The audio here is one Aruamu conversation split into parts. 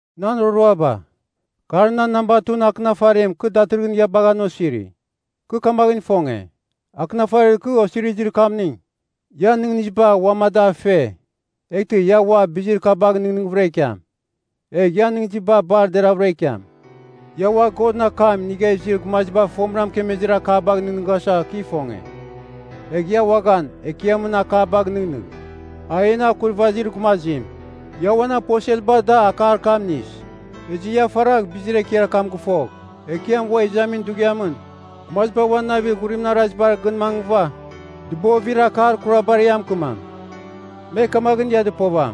Nan roroaba, kar nan namba 2ɨn akɨnafarim kɨ datɨrɨghɨn ia bagha an osiri. Kɨ kamaghɨn ifonge, akɨnafarir kɨ osirizir kamning, ian nɨghnɨziba uam a da fe, eghtɨ ia ua bizir kabagh nɨghnɨghvɨra ikiam, egh ian nɨghnɨziba bar deravɨra ikiam. Ia ua Godɨn akam inigha izir gumaziba fomɨra mɨkemezir akabagh nɨghnɨghasa kɨ ifonge. Egh ia uaghan Ekiamɨn akabagh nɨghnɨgh, a en Akurvazir Gumazim. Ia uan aposelba da akar kam inis. Ezɨ ia faragh bizir ekiar kam gɨfogh, Ekiam ua izamin dughiamɨn, gumaziba uan navir ghurimɨn arazibar gɨn mangɨva dɨbovir akar kurabar ia mɨkɨmam. Me kamaghɨn ia dɨpovam,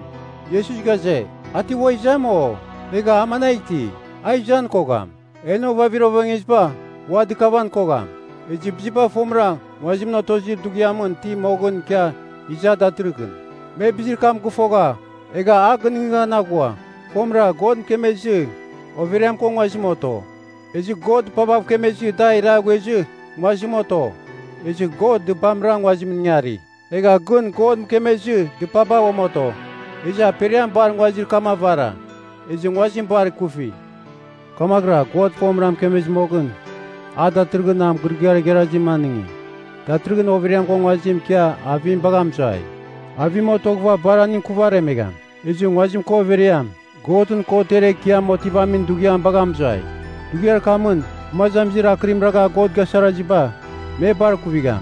“Iesus ghaze, a ti ua izam, o? Egha a managh iti? A izan kogham. En ovavir ovengeziba ua dɨkavan kogham. Ezɨ biziba fomɨra nguazim otozir dughiamɨn iti moghɨn ikia iza datɨrɨkɨn.” Me bizir kam gɨfogha, egha a gɨnɨghnɨghan aghua. Fomɨra God mɨkemezɨ overiam ko nguazim oto. Ezɨ God dɨpabav kemezɨ da iraghuezɨ nguazim oto. Ezɨ God dɨpamra nguazimɨn ingari. Egha gɨn God mɨkemezɨ dɨpaba uam oto. Ezɨ aperiam bar nguazir kam avara, ezɨ nguazim bar ikufi. Kamaghɨra God fomɨra mɨkemezir moghɨn, a datɨrɨghɨn mɨgɨrɨgɨar igharazim anɨngi, datɨrɨghɨn overiam ko nguazim ikia avim bagha mɨzuai, avim otoghɨva bar aning kuvaremegham. Ezɨ nguazim ko overiam Godɨn Kotiar Ekiam Otivamin Dughiam bagha mɨzuai. Dughiar kamɨn gumazamizir akɨrim ragha God gasaraziba, me bar kuvigham.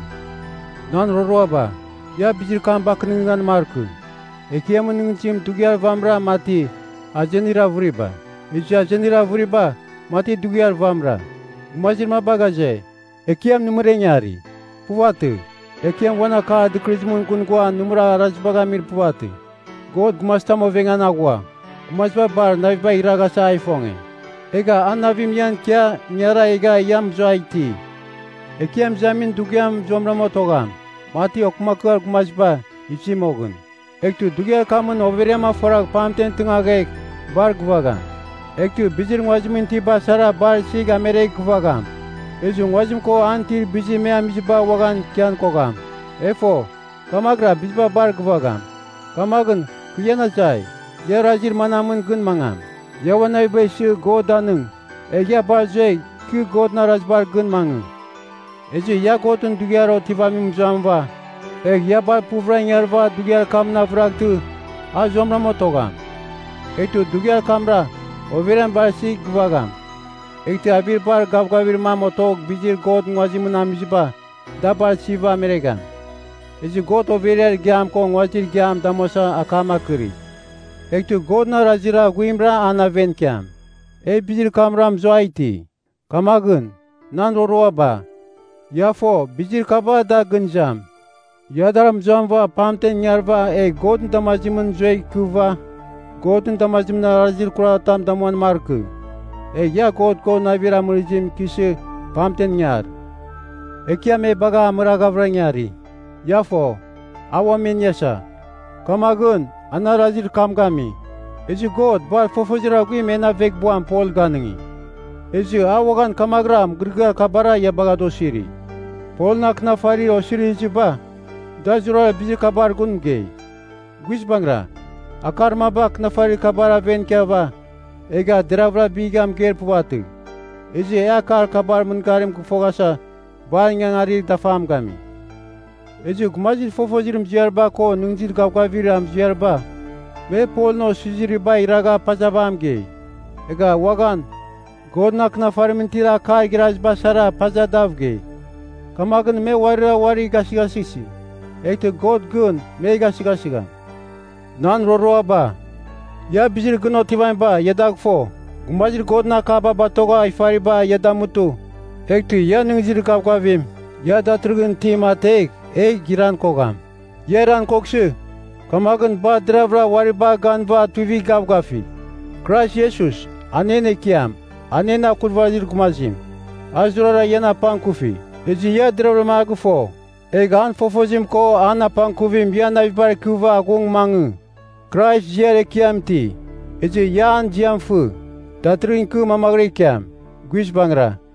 Nan roroaba, ia bizir kam a bakɨnɨghnɨghan markɨ. Ekiamɨn nɨghnɨzim dughiar vamɨra mati, azenir avɨriba, ezɨ azenir avɨriba mati dughiar vamɨra. Gumazir maba ghaze, Ekiam nɨmɨra ingari. Puvatɨ. Ekiam uan akar dɨkɨrɨzimɨn gɨn ghua nɨmɨra arazibagh amir puvatɨ. God gumazitam ovengan aghua. Gumaziba bar navibagh iraghasa a ifonge, egha an navim ian ikia ingara egha ia mɨzua iti. Ekiam Izamin Dughiam zuamɨram otogham, mati okɨmakɨar gumaziba izi moghɨn. Eghtɨ dughiar kamɨn overiam afuaragh pamten tɨngaghegh bar gɨvagham. Eghtɨ bizir nguazimɨn itiba sara bar isigh ameregh gɨvagham. Ezɨ nguazim ko an itir bizir me amiziba ua ikian kogham. E fo, kamaghɨra biziba bar gɨvagham. Kamaghɨn kɨ ian azai, ia arazir manamɨn gɨn mangam? Ia uan naviba isɨ God danɨng, egh ia bar zuegh ikɨ Godɨn arazibar gɨn mangɨ. Ezɨ ia Godɨn Dughiar Otivamim mɨzuamɨva, egh ia bar puvɨra ingarɨva dughiar kamɨn avɨraghtɨ, a zuamɨra otogham. Eghtɨ dughiar kamra overiam bar isigh gɨvagham, eghtɨ avir bar gavgavir mam otogh bizir God nguazimɨn amiziba, da bar isiva ameregham. Ezɨ God overiar igiam ko nguazir igiam damuasa akam akɨri, eghtɨ Godɨn arazir aghuimra an aven ikiam. E bizir kamra mɨzua iti. Kamaghɨn, nan roroaba, ia fo bizir kaba da gɨn izam, ia dar mɨzuamɨva pamtem ingarɨva egh Godɨn damazimɨn zuegh ikɨva, Godɨn damazimɨn arazir kuratam damuan markɨ. Egh ia God ko navir amɨrɨzimɨn ikɨsɨ pamtem ingar. Ekiam e bagha amɨrɨghavɨra ingari. Ia fogh, a uam e iniasa, kamaghɨn an arazir kam gami. Ezɨ God bar fofozir aghuim en aveghbuam Pol ganɨngi, ezɨ a uaghan kamaghɨra mɨgɨrɨgɨar kabara ia bagha da osiri. Polɨn akɨnafarir osiriziba, da zurara bizir kabar gun mɨgei. Guizbangɨra, akar maba akɨnafarir kabar aven ikiava, egha deravɨra bigha mɨgeir puvatɨ. Ezɨ e akar kabar mɨngarim gɨfoghasa bar ingangarir dafam gami. Ezɨ gumazir fofozir muziariba ko nɨghnɨzir gavgavir muziariba, me Polɨn osirizibagh iragha pazava a mɨgei. Egha uaghan Godɨn akɨnafarimɨn itir akar igharaziba sara paza dav gei. Kamaghɨn me uarira uari gasɨghasɨsi, eghtɨ God gɨn me gasɨghasɨgham. Nan roroaba, ia bizir gɨn otivamiba ia dagh fo. Gumazir Godɨn akaba batogha ifariba ia damutɨ, eghtɨ ia nɨghnɨzir gavgavim ia datɨrɨghɨn itim ategh egh iran kogham. Ia iran koghsɨ, kamaghɨn bar deravɨra uari bagh ganɨva tuivigh gavgafigh. Krais Iesus, a en Ekiam, a en Akurvazir Gumazim, a zurara ian apangkufi, ezɨ ia deravɨra a gɨfo. Egh an fofozim ko an apangkuvim ian navibar ikɨva aghung mangɨ. Krais ziar ekiam iti, ezɨ ia an ziam fɨ, datɨrɨghɨn ikɨ mamaghɨra ikiam. Guizbangɨra.